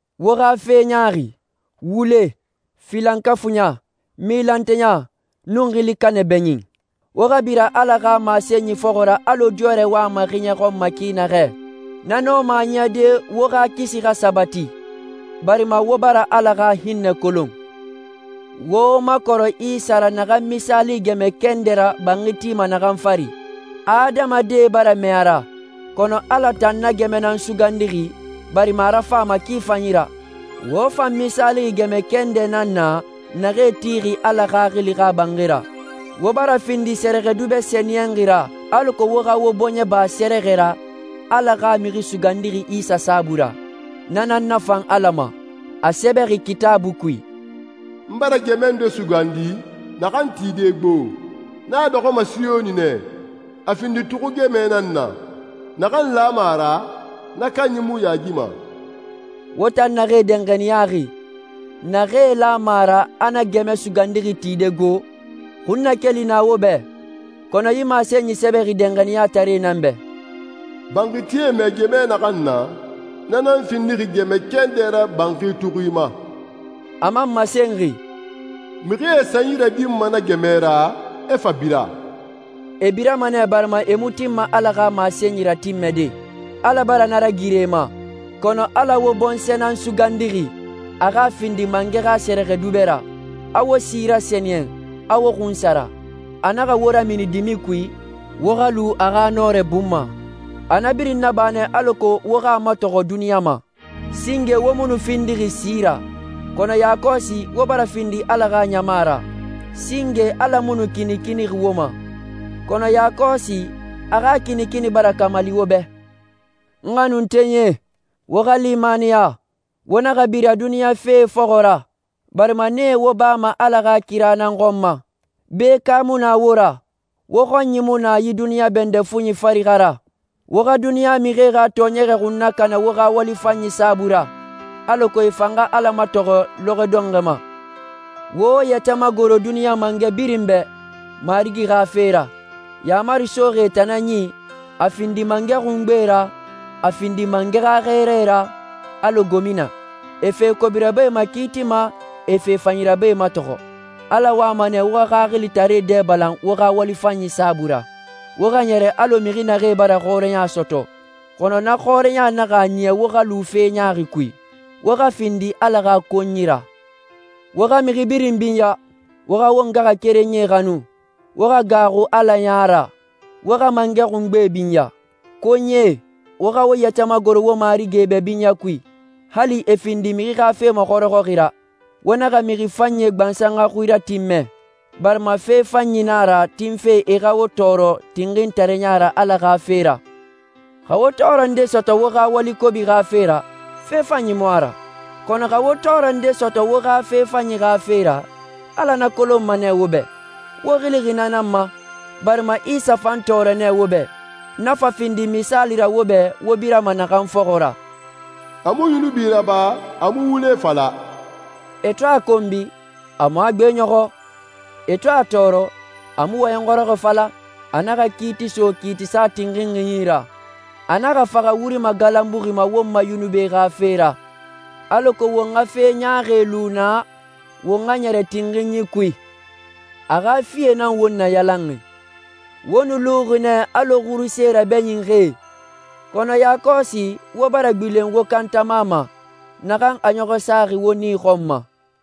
Wo xa fe ɲaaxi, wule, filankafuiɲa, milanteya, nun xili kanɛ bɛɲin. Wo xa bira Ala xa masenyi fɔxɔ ra alɔ diyɔrɛ wama xiɲɛ xɔn ki naxɛ. Na nɔma a niyade wo xa kisi xa sabati, barima wo bara Ala xa hinnɛ kolon. Wo wo makɔrɛ Isa ra naxan misaalixi gɛmɛ kɛndɛ ra banxi tima naxan fari. Adamadie bara mɛɛ a ra, kɔnɔ Ala tan na gɛmɛ nan sugandixi barima a rafan a ma ki fanyi ra. Wo fan misaalixi gɛmɛ kɛndɛe nan na naxee tixi Ala Xaxili xa banxi ra. Wo bara findi sɛrɛxɛdubɛ sɛniyɛnxie ra alako wo xa wo bɔɲɛ ba sɛrɛxɛ ra Ala xa Mixi Sugandixi Isa saabui ra. Na nan nafan Ala ma. A sɛbɛxi Kitaabui kui, «N bara gɛmɛ nde sugandi, naxan tide gbo. N a dɔxɔma Siyoni nɛ, a findi tuxui gɛmɛ nan na. Naxan lama a ra, na kanyi mu yaagima.» Wo tan naxee danxaniyaxi, naxee lama a ra a na gɛmɛ sugandixi tide gbo, xunnakeli na wo bɛ. Kɔnɔ yi masenyi sɛbɛxi danxaniyataree nan bɛ, «Banxitie mɛɛ gɛmɛ naxan na, na nan findixi gɛmɛ kɛndɛ ra banxi tuxui ma.» A man masenxi, «Mixie e sanyi radinma na gɛmɛ ra, e fa bira.» E birama nɛ barima e mu tinma Ala xa masenyi ratinmɛde. Ala bara na ragiri e ma. Kɔnɔ Ala wo bɔnsɔɛ nan sugandixi, a xa findi mangɛ xa sɛrɛxɛdubɛe ra. A wo si rasɛniyɛn, a wo xunsara. A naxa wo ramini dimi kui, wo xa lu a xa nɔrɛ bun ma. A na birin naba nɛ alako wo xa a matɔxɔ duniɲa ma. Singe wo mu nu findixi si ra, kɔnɔ yakɔsi wo bara findi Ala xa ɲama ra. Singe Ala mu nu kinikinixi wo ma, kɔnɔ yakɔsi a xa kinikini bara kamali wo bɛ. N xanuntenyie, wo xa limaniya. Wo naxa bira duniɲa fee fɔxɔ ra, barima nee wo bama Ala xa kira nan xɔn ma. Bekae mu na wo ra. Wo xɔnyi mu na yi duniɲa bɛndɛ fuɲi fari xa ra. Wo xa duniɲa mixie xa tɔɔɲɛgɛ xun nakana wo xa wali fanyi saabui ra, alako e fan xa Ala matɔxɔ lɔxɔɛ dɔnxɔɛ ma. Wo wo yɛtɛ magoro duniɲa mangɛ birin bɛ Marigi xa fe ra. Yaamari soxi e tan nan yi, a findi mangɛ xungbe ra, a findi mangɛ xa xɛɛrae ra, alɔ gomina. E fe kobi rabae makiitima, e fe fanyi rabae matɔxɔ. Ala wama nɛ wo xa xaxilitaree dɛ balan wo xa wali fanyi saabui ra. Wo xa ɲɛrɛ alɔ mixi naxee bara xɔrɛya sɔtɔ, kɔnɔ na xɔrɛya naxa a niya wo xa lu fe ɲaaxi kui. Wo xa findi Ala xa konyie ra. Wo xa mixi birin binya. Wo xa wo ngaxakerenyie xanu. Wo xa gaaxu Ala ya ra. Wo xa mangɛ xungbe binya. Konyie, wo xa wo yɛtɛ magoro wo marigie bɛ binyɛ kui, hali e findi mixi xa fe maxɔrɔxɔxi ra. Wo naxa mixi fanyie xa gbansan xui ratinmɛ, barima fe fanyi nan a ra tinfe e xa i tɔɔrɔ tinxintareya ra Ala xa fe ra. Xa wo tɔɔrɛ nde sɔtɔ wo xa wali kobi xa fe ra, fe fanyi mu a ra. Kɔnɔ xa wo tɔɔrɛ nde sɔtɔ wo xa fe fanyi xa fe ra, Ala na kolonma nɛ wo bɛ. Wo xilixi na nan ma, barima Isa fan tɔɔrɔ nɛ wo bɛ, na fa findi misaali ra wo bɛ wo birama naxan fɔxɔ ra. «A mu yunubi raba, a mu wule fala.» E to a konbi, a mu a gbeɲɔxɔ. E to a tɔɔrɔ, a mu wɔyɛn xɔrɔxɔɛ fala. A naxa kiiti so kiitisa tinxinxi yi ra. A naxa faxa wuri magalanbuxi ma won ma yunubie xa fe ra, alako won xa fe ɲaaxi lu na, won xa ɲɛrɛ tinxinyi kui. A xa fie nan wo rayalanxi. Wo nu luxi nɛ alɔ xuruse rabɛɲinxie, kɔnɔ yakɔsi wo bara gbilen wo kantama ma, naxan a ɲɔxɔ saxi wo nii xɔn ma.